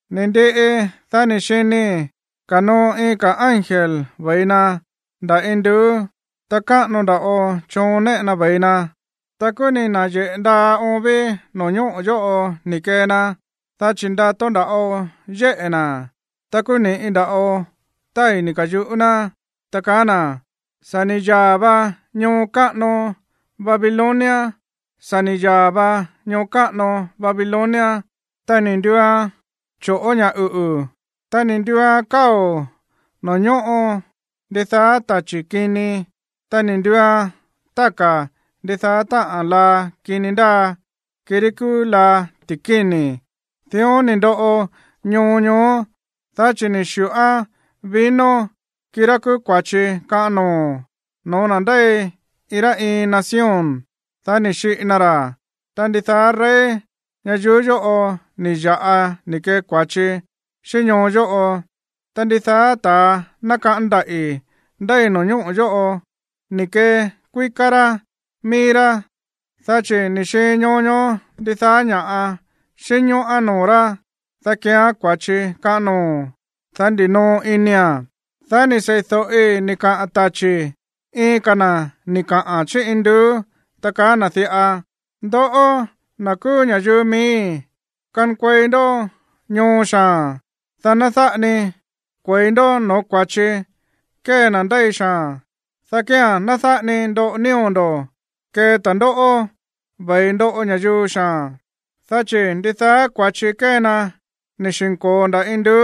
Ni̱ ndiꞌi, dá ni̱ xinii̱ ko̱noo iin ka̱ ángel ve̱i na nda̱ induú, ta káꞌano nda̱ꞌo choon néꞌe na ve̱i na, ta kúú ni̱ na̱yeꞌe̱ ndaa oon ví no̱ñóꞌo̱ yóꞌo ni̱ kee na, dá chi̱ ndato nda̱ꞌo yéꞌe̱ na̱. Ta kúú ni̱ꞌi nda̱ꞌo tái̱ ni̱ ka̱yuꞌú ná, ta kaá na̱: ―Sa̱ ni̱ yaa̱ va ñoo káꞌano Babilonia, sa̱ ni̱ yaa̱ va ñoo káꞌano Babilonia. Ta ni̱ nduuan choꞌo̱ ña̱ uꞌu̱, ta ni̱ nduuan káo̱ noo̱ ñóꞌo ndidaá tachi̱ kini, ta ni̱ nduuan táka̱ ndidaá táꞌa̱n laa kini ndáa, kirí kúú laa ti̱kíni̱. Dión ni̱ ndoꞌo ñoo ñoó, dá chi̱ ni̱ xi̱ꞌoan vino, kirá kúú kua̱chi kaꞌan noo̱, no̱ó na̱ ndéi iin rá iin nación, dá ni̱ xiꞌi na ra̱. Ta ndidaá rey ñayuú yóꞌo ni̱ ya̱ꞌa ni̱ kee kua̱chi xíꞌín ñoo yóꞌo. Ta ndidaá ta̱a nákaꞌán ndaꞌi̱ ndéi no̱ñóꞌo̱ yóꞌo ni̱ kekuíká rá mií rá, dá chi̱ ni̱ xiin ñoo ñoó ndidaá ña̱ꞌa xínñóꞌán noo̱ rá, dá keean kua̱chi kaꞌan noo̱, dá ndinoo inia̱n. Dá ni̱ sei̱do̱ꞌi ni̱ kaꞌa̱n tachi̱ iin ka̱ na̱ ni̱ kaꞌa̱n chí induú, ta kaá na̱ diꞌa: ―Ndoꞌó, na̱ kúú ña̱yuu miíi̱, kankuei ndó ñoo xaa̱n, dá ná dáꞌa ni kue̱i ndó no̱ó kua̱chi kée na̱ ndéi xaa̱n, dá kía̱n ná dáꞌa ni ndoꞌo nío̱ ndo̱ kee ta̱ndóꞌó ve̱i ndoꞌo ña̱yuu xaa̱n. Dá chi̱ ndidaá kua̱chi kée na ni̱ xi̱nko̱o nda̱ induú,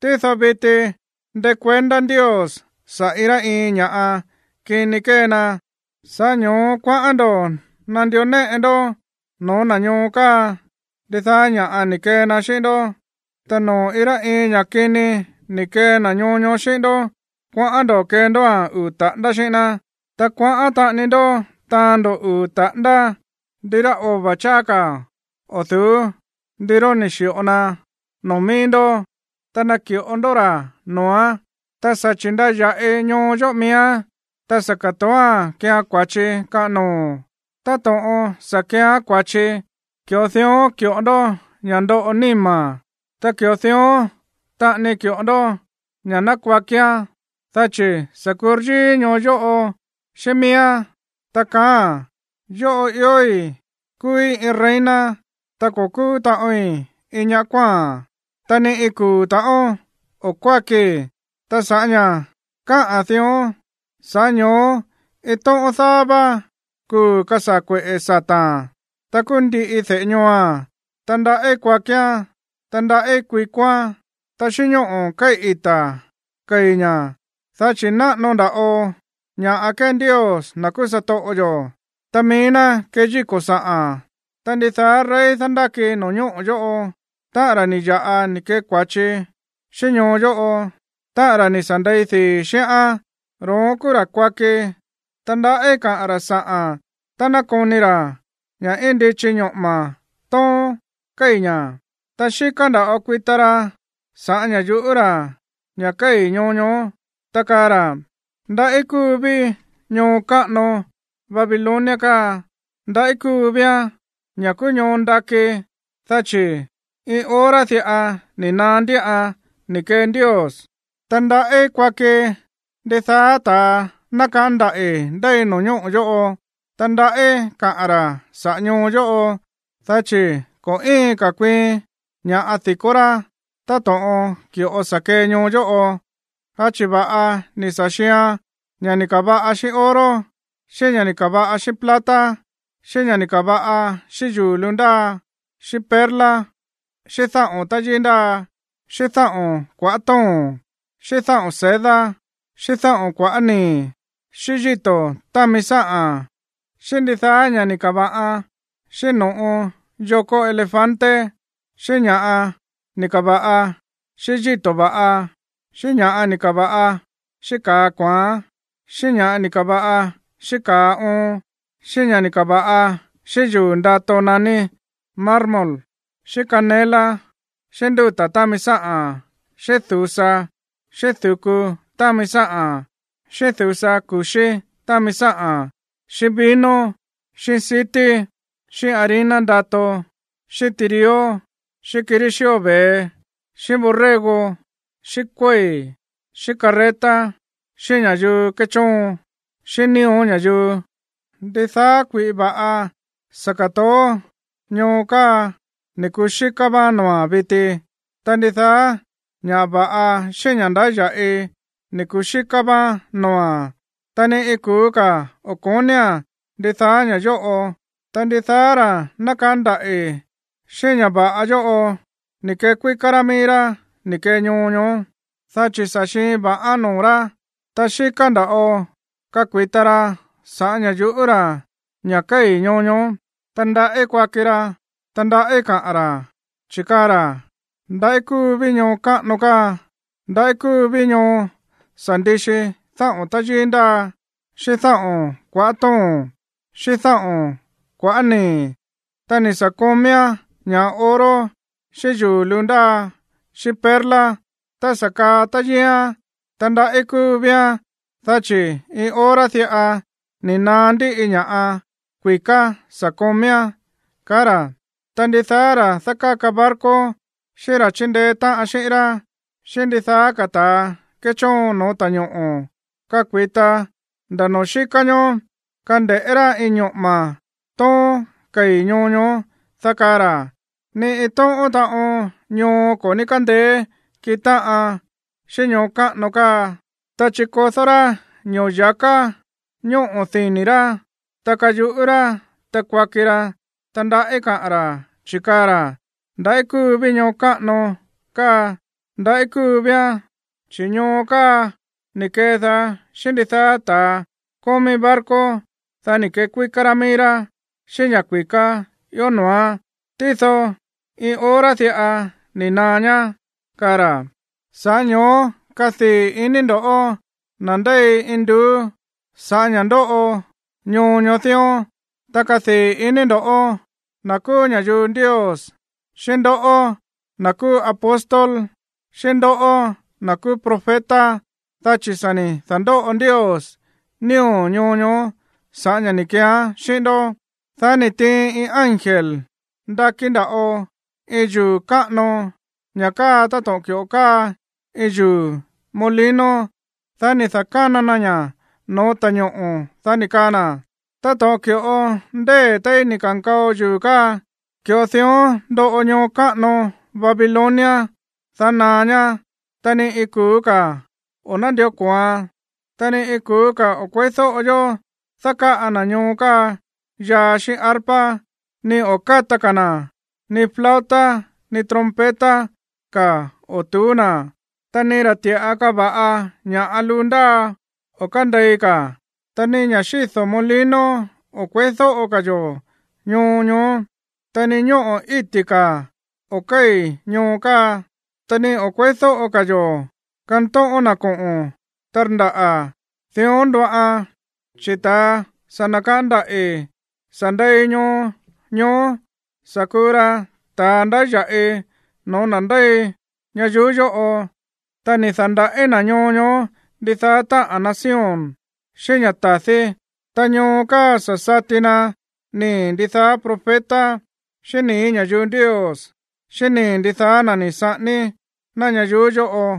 tído viti ndékuendá Ndios saꞌa̱ iin rá iin ña̱ kini kée na. Sa̱ꞌá ño̱ó kuaꞌán ndo̱ nandió néꞌe ndó no̱ó na̱ ñoo káa ndidaá ña̱ꞌa ni̱ kee na xíꞌín ndó. Ta noo̱ iin rá iin ña̱ kini ni̱ kee na̱ ñoo ñoó xíꞌín ndó, kuaꞌán ndo̱ kee ndóa̱n uu̱ taꞌándá xíꞌín ná. Ta kuaꞌán taꞌani ndó taán ndo̱ uu̱ taꞌándá ndirá ova̱ cháá ka̱ o̱ du̱ú ndiróón ni̱ xi̱ꞌo na noo̱ míí ndó, ta naki̱ꞌo ndó ra̱ noo̱án. Ta sa̱ chi̱ndaya̱ꞌi ñoo yóꞌo miíán, ta sa̱ ka̱toóa̱n keeán kua̱chi kaꞌan noo̱. Táto̱ꞌon sa̱ keeán kua̱chi, ki̱ꞌo dión ki̱ꞌo ndó ña̱ ndoꞌo níma̱n, ta ki̱ꞌo dión taꞌani ki̱ꞌo ndó ña̱ ná kuakián. Dá chi̱ sa̱ kuryíí ñoo yóꞌo xíꞌín miíán, ta kaáa̱n: “Yóꞌo iói̱ kúúí iin reina, ta ko̱ kúú taꞌoin iin ña̱ kuáa̱n, ta ni iin kuu̱ ta̱ꞌón o̱ kuákii.” Ta sa̱ꞌá ña̱ káꞌa̱n dión, sa̱ꞌá ño̱ó iin tóꞌón daá vá kuu̱ kasaa̱ kueꞌe̱ sata̱a̱n, ta kuu ndiꞌi de̱ꞌe ñooa̱n, ta ndaꞌí kuakián, ta ndaꞌí kuikoán, ta xíꞌín ñóꞌo̱ kéi̱ ita̱ kei̱ ña̱, dá chi̱ náꞌano nda̱ꞌo ña̱ꞌa kee Ndios, na̱ kúú satoꞌo yo̱, ta mií ná keyíko̱ sa̱ꞌa̱n. Ta ndidaá rey dándáki no̱ñóꞌo̱ yóꞌo, táꞌa̱n ra̱ ni̱ ya̱ꞌa ni̱ kee kua̱chi xíꞌín ñoo yóꞌo, táꞌa̱n ra̱ ni̱ sa̱ ndei dii̱ xíꞌán, ro̱ón kúú ra̱ kuaki, ta ndaꞌí kaꞌa̱n ra̱ sa̱ꞌa̱n tá ná koni ra̱ ña̱ íin ndichi ñoꞌo̱ma̱ tóón kéi̱ ña̱. Ta xíká nda̱ꞌo kuita ra sa̱ꞌá ña̱ yu̱ꞌú ra̱ ña̱ kéi̱ ñoo ñoó, ta kaa ra̱: ―Ndaꞌí kúu ví ñoo káꞌano Babilonia káa, ndaꞌí kúú víán, ña̱ kúú ñoo ndakí, dá chi̱ iin hora diꞌa ni̱ naá ndíꞌan ni̱ kee Ndios. Ta ndaꞌí kuaki ndidaá ta̱ nákaꞌán ndaꞌi̱ ndéi no̱ñóꞌo̱ yóꞌo, ta ndaꞌí kaꞌa̱n ra̱ saꞌa̱ ñoo yóꞌo, dá chi̱ ko̱ íin ka̱ kuiin ña̱ di̱kó rá táto̱ꞌon ki̱ꞌo sa̱ kee ñoo yóꞌo, dá chi̱ va̱ꞌa ni̱ sa̱ xiian ña̱ ni̱ ka̱va̱ꞌa xíꞌín oro, xíꞌín ña̱ ni̱ ka̱va̱ꞌa xíꞌín plata, xíꞌín ña̱ ni̱ ka̱va̱ꞌa xíꞌín yuu̱ luu ndáa, xíꞌín perla, xíꞌín dáꞌo̱n táyíí ndáa, xíꞌín dáꞌo̱n kua̱ꞌá to̱ón, xíꞌín dáꞌo̱n seda, xíꞌín dáꞌo̱n kua̱ꞌá nii̱, xíꞌín yíto̱ támi sáꞌa̱n, xíꞌín ndidaá ña̱ ni̱ ka̱va̱ꞌa xíꞌín no̱ꞌo yokó elefante, xíꞌín ña̱ ni̱ ka̱va̱ꞌa xíꞌín yíto̱ va̱ꞌa, xíꞌín ña̱ ni̱ ka̱va̱ꞌa xíꞌín ka̱a kua̱án, xíꞌín ña̱ ni̱ ka̱va̱ꞌa xíꞌín ka̱a oon, xíꞌín ña̱ ni̱ ka̱va̱ꞌa xíꞌín yuu̱ ndato naní marmol, xíꞌín canela, xíꞌín ndúta̱ támi sáꞌa̱n, xíꞌín du̱sa, xíꞌín du̱ku támi sáꞌa̱n, xíꞌín du̱sa ku̱xí támi sáꞌa̱n, xíꞌín vino, xíꞌín sití, xíꞌín harina ndato, xíꞌín tirió, xíꞌín kirí xío ve̱e, xíꞌín borrego, xíꞌín kuéi̱, xíꞌín carreta, xíꞌín ña̱yuu kéchóon, xíꞌín nío̱ ña̱yuu. Ndidaá kui̱ꞌi va̱ꞌa sa̱ ka̱toó ñoo káa ni̱ kuxíká vá noo̱a̱n viti. Ta ndidaá ña̱ va̱ꞌa xíꞌín ña̱ ndáya̱ꞌi ni̱ kuxíká vá noo̱a̱n, ta ni iin kuu̱ ka̱ o̱ ko̱nía̱n ndidaá ña̱ yóꞌo. Ta ndidaá ta̱ nákaꞌán ndaꞌi̱ xíꞌín ña̱ va̱ꞌa yóꞌo ni̱ kekuíká rá mií rá ni̱ kee ñoo ñoó, dá chi̱ sa̱ xiin va̱ꞌán noo̱ rá. Ta xíká nda̱ꞌo kakui̱ta ra sa̱ꞌá ña̱ yu̱ꞌú ra̱ ña̱ kéi̱ ñoo ñoó, ta ndaꞌí kuaki ra, ta ndaꞌí kaꞌa̱n ra̱, chi̱ kaa ra̱: ―Ndaꞌí kúu ví ñoo káꞌano káa, ndaꞌí kúú ví ñoo sa̱ ndixi dáꞌo̱n táyíí ndáa, xíꞌín dáꞌo̱n kua̱ꞌá to̱ón xíꞌín dáꞌo̱n kua̱ꞌá nii̱, ta ni̱ sa̱ komíán ña̱ꞌa oro xíꞌín yuu̱ luu ndáa xíꞌín perla, ta sa̱ kaa táyííán. Ndaꞌí kúu víán, dá chi̱ iin hora diꞌa ni̱ naá ndíꞌi ña̱ kui̱ká sa̱ komíán ―kaa ra̱. Ta ndidaá ra̱ dákáka barco xíꞌín ra̱ chíndeé táꞌan xi̱ꞌín rá, xíꞌín ndidaá ka̱ ta̱a kéchóon no̱ó ta̱ñoꞌo̱ kakui̱ta nda̱ noo̱ xíká ñoó kande̱ꞌé rá íin ñoꞌo̱ma̱ tóón kéi̱ ñoo ñoó, dá kaa ra̱: ―Ni iin tóꞌón taꞌon ñoo ko̱ ní kándeé kiꞌin táꞌan xíꞌín ñoo káꞌano káa. Ta chikodó rá ño̱ya̱ká ñóꞌo̱ dini̱ rá, ta kayuꞌú rá, ta kuaki ra, ta ndaꞌí kaꞌa̱n ra̱, chi̱ kaa ra̱: ―Ndaꞌí kúu ví ñoo káꞌano káa, ndaꞌí kúu víán, chi̱ ñoo káa ni̱ kedaá xíꞌín ndidaá ta̱ kómí barco, dá ni̱ kekuíká rá mií rá xíꞌín ña̱ kui̱ká ió noo̱án. Tído iin hora diꞌa ni̱ naá ñá ―kaa ra̱. Sa̱ꞌá ño̱ó kadii̱ iní ndo̱ꞌó, na̱ ndéi induú, sa̱ꞌá ña̱ ndóꞌo ñoo ñoó dión, ta kadii̱ iní ndo̱ꞌó, na̱ kúú ña̱yuu Ndios, xíꞌín ndoꞌó, na̱ kúú apóstol, xíꞌín ndoꞌó, na̱ kúú profeta, dá chi̱ sa̱ ni̱ da̱ndóꞌo Ndios nío̱ ñoo ñoó sa̱ꞌá ña̱ ni̱ keeán xíꞌín ndó. Dá ni̱ tiin iin ángel ndakí nda̱ꞌo iin yuu̱ káꞌano, ña̱ káa táto̱ꞌon ki̱ꞌo káa iin yuu̱ molino. Dá ni̱ da̱kána na ña̱ no̱ó ta̱ñoꞌo̱, dá ni̱ kaa na̱: ―Táto̱ꞌon ki̱ꞌo ndée̱ téí ni̱ ka̱nkao yuu̱ káa, ki̱ꞌo dión ndoꞌo ñoo káꞌano Babilonia, dá naá ñá, ta ni iin kuu̱ ka̱ o̱ nándió ko̱oan. Ta ni iin kuu̱ ka̱ o̱ kueídóꞌo yó dákáꞌa na̱ ñoo káa yaa xíꞌín arpa, ni o̱ káta ka̱ na̱, ni flauta ni trompeta ka̱ o̱ tu̱ú na̱, ta ni ra̱ ti̱ꞌa káva̱ꞌa ña̱ luu ndáa o̱ kándei ka̱, ta ni ña̱ xído̱ molino o̱ kueídóꞌo ka̱ yo̱ ñoo ñoó. Ta ni ñóꞌo̱ íti̱ ka̱ o̱ kéi̱ ñoo káa, ta ni o̱ kueídóꞌo ka̱ yo̱ kantóꞌón na̱ koꞌo̱n tandaꞌa̱. Dión ndoꞌan, chi̱ ta̱ sa̱ nakaꞌán ndaꞌi̱ sa̱ ndei ñoo ñoó sa̱ kuu ra ta̱a ndáya̱ꞌi no̱ó na̱ ndéi ñayuú yóꞌo, ta ni̱ da̱ndaꞌí na̱ ñoo ñoó ndidaá táꞌa̱n nación xíꞌín ña̱ ta̱dí. Ta ñoo káa sa̱ sati na nii̱ ndidaá profeta xíꞌín nii̱ ña̱yuu Ndios xíꞌín nii̱ ndidaá na̱ ni̱ saꞌání ná ñayuú yóꞌo.